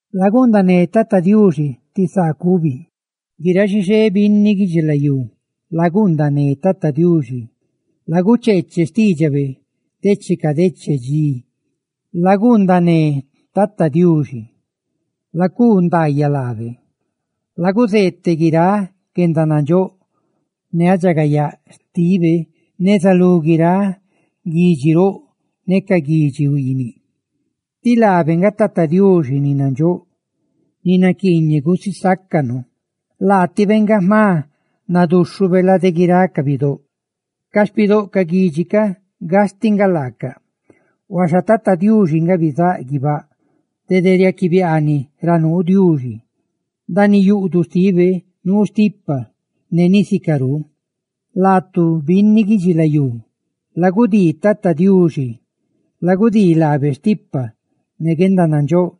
Laguundané Tata Diuxi ti saa cubi; guiráꞌ xixé binni guidxilayú, laguundané Tata Diuxi; lagucheeche xtiidxabe decheca deche dxi, laguundané Tata Diuxi, lacuu ndaayaꞌ lábe. Laguzeeteꞌ guiráꞌ guendanandxóꞌ ne guendaridxagayaa xtibe neza lú guiráꞌ guidxi roꞌ ne ca guidxi huiiniꞌ, tí laabe nga Tata Diuxi ni nandxóꞌ ni naquiiñeꞌ gusisácanu, ¡laatibe nga jma nadúxhube lade guiráꞌ ca bidóꞌ! Ca xpidóꞌ ca guidxi ca gastiꞌ nga laacaꞌ, huaxa Tata Diuxi nga bizáꞌ guibáꞌ. ¡Dede riaquibiaaniꞌ ra nuu Diuxi! ¡Ndaaniꞌ yuꞌduꞌ xtibe nuu stipa ne ni sicarú! Laatu binni guidxilayú, lagudii Tata Diuxi, lagudii laabe stipa ne guendanandxóꞌ;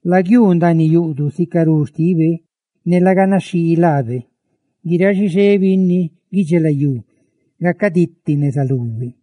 laguiuu ndaaniꞌ yuꞌduꞌ sicarú xtibe ne la ganaxhii laabe. ¡Guiráꞌ xixé binni guidxilayú gacaditi neza lube!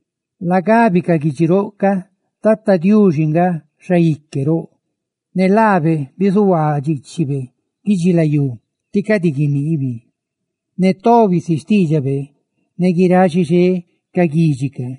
Lagabi ca guidxi roꞌ ca Tata Diuxi nga: «¡Xaique roꞌ!» Ne laabe bizuhuaa dxiichibe guidxilayú, tí cadi guiniibi; ne tobi si xtiidxabe ne guiráꞌ xixé ca guidxi ca.